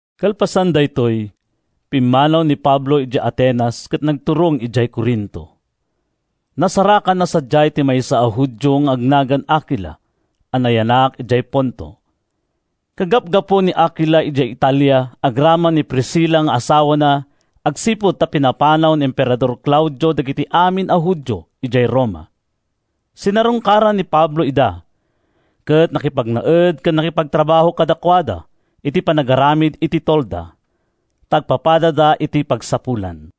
Kalpasan daytoy, pimmanaw ni Pablo idiay Atenas ket nagturong idiay Corinto. Nasarakanna sadiay ti maysa a Judio nga agnagan Akila a nayanak idiay Ponto. Kagapgapu ni Akila idiay Italia agraman ni Priscila nga asawana agsipud ta pinapanaw ni Emperador Claudio dagiti amin a Judio idiay Roma. Sinarungkaran ni Pablo ida ket nakipagnaed ken nakipagtrabaho kadakuada iti panagaramid iti tolda, ta agpapadada iti pagsapulan.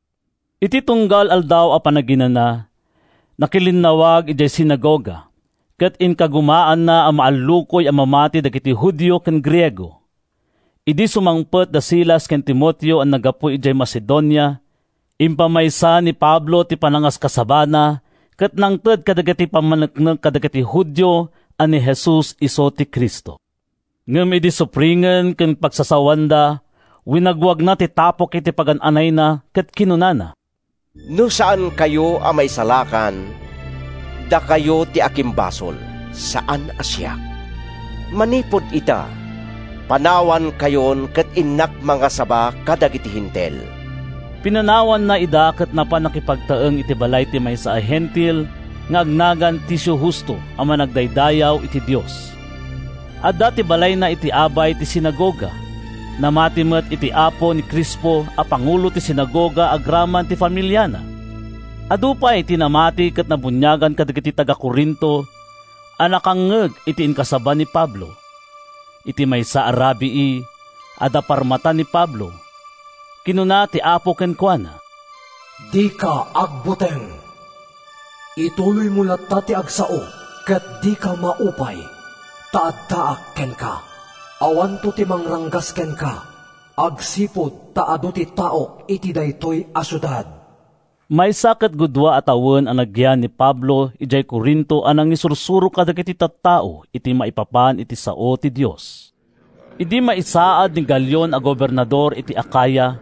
Iti tunggal Aldaw a Panaginana, nakilinnawag idiay sinagoga, ket inkagumaanna a maallukoy a mamati dagiti Judio ken Griego. Idi sumangpet da Silas ken Timoteo a naggapu idiay Macedonia, impamaysa ni Pablo ti panangaskasabana ket nangted kadagiti pammaneknek kadagiti Judio a ni Jesus isu ti Cristo. Ngem idi supringen ken pagsasawanda, winagwagna ti tapok iti pagan-anayna ket kinunana: “No saankayo a maisalakan, dakayo ti akimbasol, saan a siak. Manipud ita, panawankayon ket innak mangasaba kadagiti Hentil.” Pinanawanna ida ket napan nakipagtaeng iti balay ti maysa a Hentil nga agnagan Ticio Justo a managdaydayaw iti Dios. Adda ti balayna iti abay ti sinagoga. Namati met iti Apo ni Crispo a pangulo ti sinagoga agraman ti familiana. Adu pay ti namati ken nabuniagan kadagiti taga-Corinto a nakangngeg iti inkasaba ni Pablo. Iti maysa a rabii, adda parmata ni Pablo. Kinuna ti Apo kenkuana: “Dika agbuteng. Ituloymo latta ti agsao ket dika maupay, ta addaak kenka. Awanto ti mangranggas kenka, agsipud ta adu ti taok iti daytoy a siudad.” Maysa ket gudua a tawen a nagyan ni Pablo idiay Corinto a nangisursuro kadagiti tattao iti maipapan iti sao ti Dios. Idi maisaad ni Galion a gobernador iti Acaya,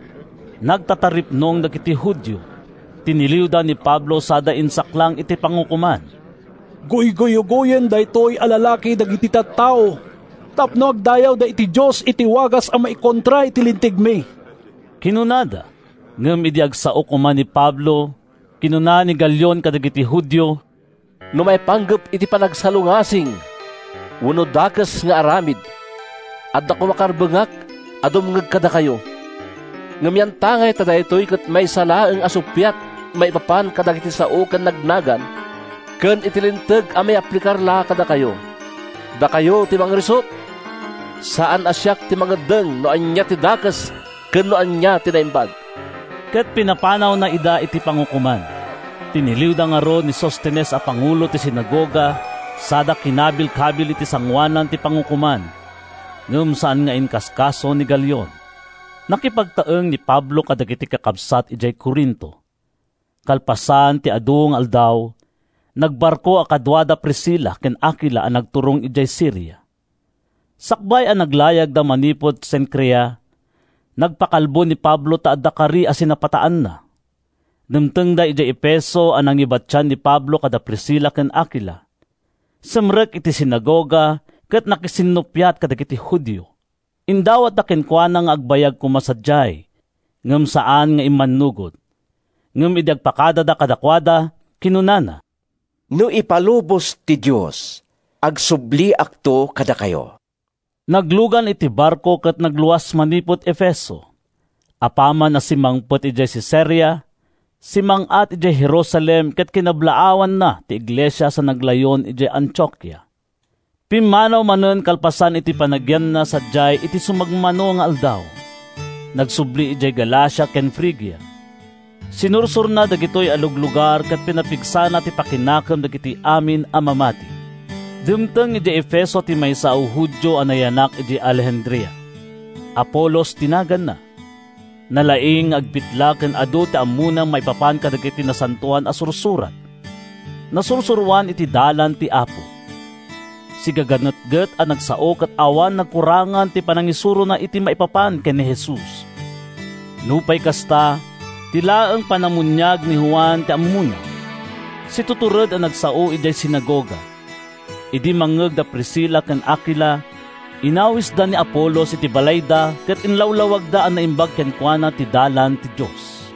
nagtataripnong dagiti Judio, tiniliwda ni Pablo sada insaklang iti pangukoman. “Guyguyugoyen daytoy a lalaki dagiti tattao tapno agdaydayawda iti Dios iti wagas a maikontra iti lintegmi!” kinunada. Ngem idi agsao koma ni Pablo, kinuna ni Galion kadagiti Judio: “No maipanggep iti panagsalungasing wenno dakes nga aramid, adda koma karbengak a dumngeg kadakayo. Ngem yantangay ta daytoy ket maysa laeng a suppiat maipapan kadagiti sao ken nagnagan, ken iti linteg a mayaplikar la kadakayo, dakayo ti mangrisut. Saan a siak ti mangeddeng no ania ti dakes ken no ania ti naimbag.” Ket pinapanawna ida iti pangukoman. Tiniliwda ngarud ni Sostenes a pangulo ti sinagoga sada kinabkabil iti sangoanan ti pangukoman, ngem saan nga inkaskaso ni Galion. Nakipagtaeng ni Pablo kadagiti kakabsat idiay Corinto. Kalpasan ti adu nga aldaw, nagbarko a kaduana da Priscila ken Akila a nagturong idiay Siria. Sakbay a naglayagda manipud Cencrea, nagpakalbo ni Pablo ta adda kari a sinapataanna. Dimtengda idiay Efeso a nangibatian ni Pablo kada Priscila ken Akila. Simrek iti sinagoga ket nakisinnuppiat kadagiti Judio. Indawatda kenkuana nga agbayag koma sadiay, ngem saan nga immannugot. Ngem idi agpakada kadakuada, kinunana, “No ipalubos ti Dios, agsubliakto kadakayo.” Naglugan iti barko ket nagluas manipud Efeso. Apaman a simmangpet idiay Cesarea, simmang-at idiay Jerusalem ket kinablaawanna ti iglesia sa naglayon idiay Antiokia. Pimmanaw manen kalpasan iti panagyanna sadiay iti sumagmamano nga aldaw. Nagsubli idiay Galacia ken Frigia. Sinursorna dagitoy a luglugar ket pinapigsana ti pakinakem dagiti amin a mamati. Dimteng idiay Efeso ti maysa a Judio a nayanak idiay Alejandria. Apolos ti naganna. Nalaing nga agbitla ken adu ti ammona maipapan kadagiti Nasantoan a Sursurat. Nasursuroan iti Dalan ti Apo. Sigaganetget a nagsao ket awan pagkurangan ti panangisurona iti maipapan ken ni Jesus. Nupay kasta, ti laeng panamuniag ni Juan ti ammona. Situtured a nagsao idiay sinagoga. Idi mangngeg da Priscila ken Akila, inawisda ni Apolos iti balayda ket inlawlawagda a naimbag kenkuana ti Dalan ti Dios.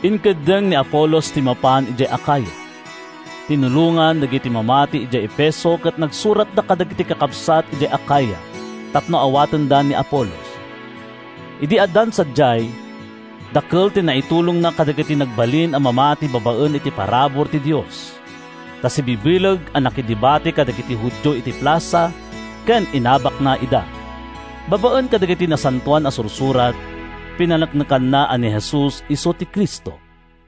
Inkeddeng ni Apolos ti mapan idiay Acaya. Tinulongan dagiti mamati idiay Efeso ket nagsuratda kadagiti kakabsat idiay Acaya tapno awatenda ni Apolos. Idi addan sadiay, dakkel ti naitulongna kadagiti nagbalin a mamati babaen iti parabur ti Dios. Ta sibibileg a nakidebate kadagiti Judio iti plasa ket inabakna ida. Babaen kadagiti Nasantoan a Sursurat, pinaneknekanna a ni Jesus isu ti Cristo.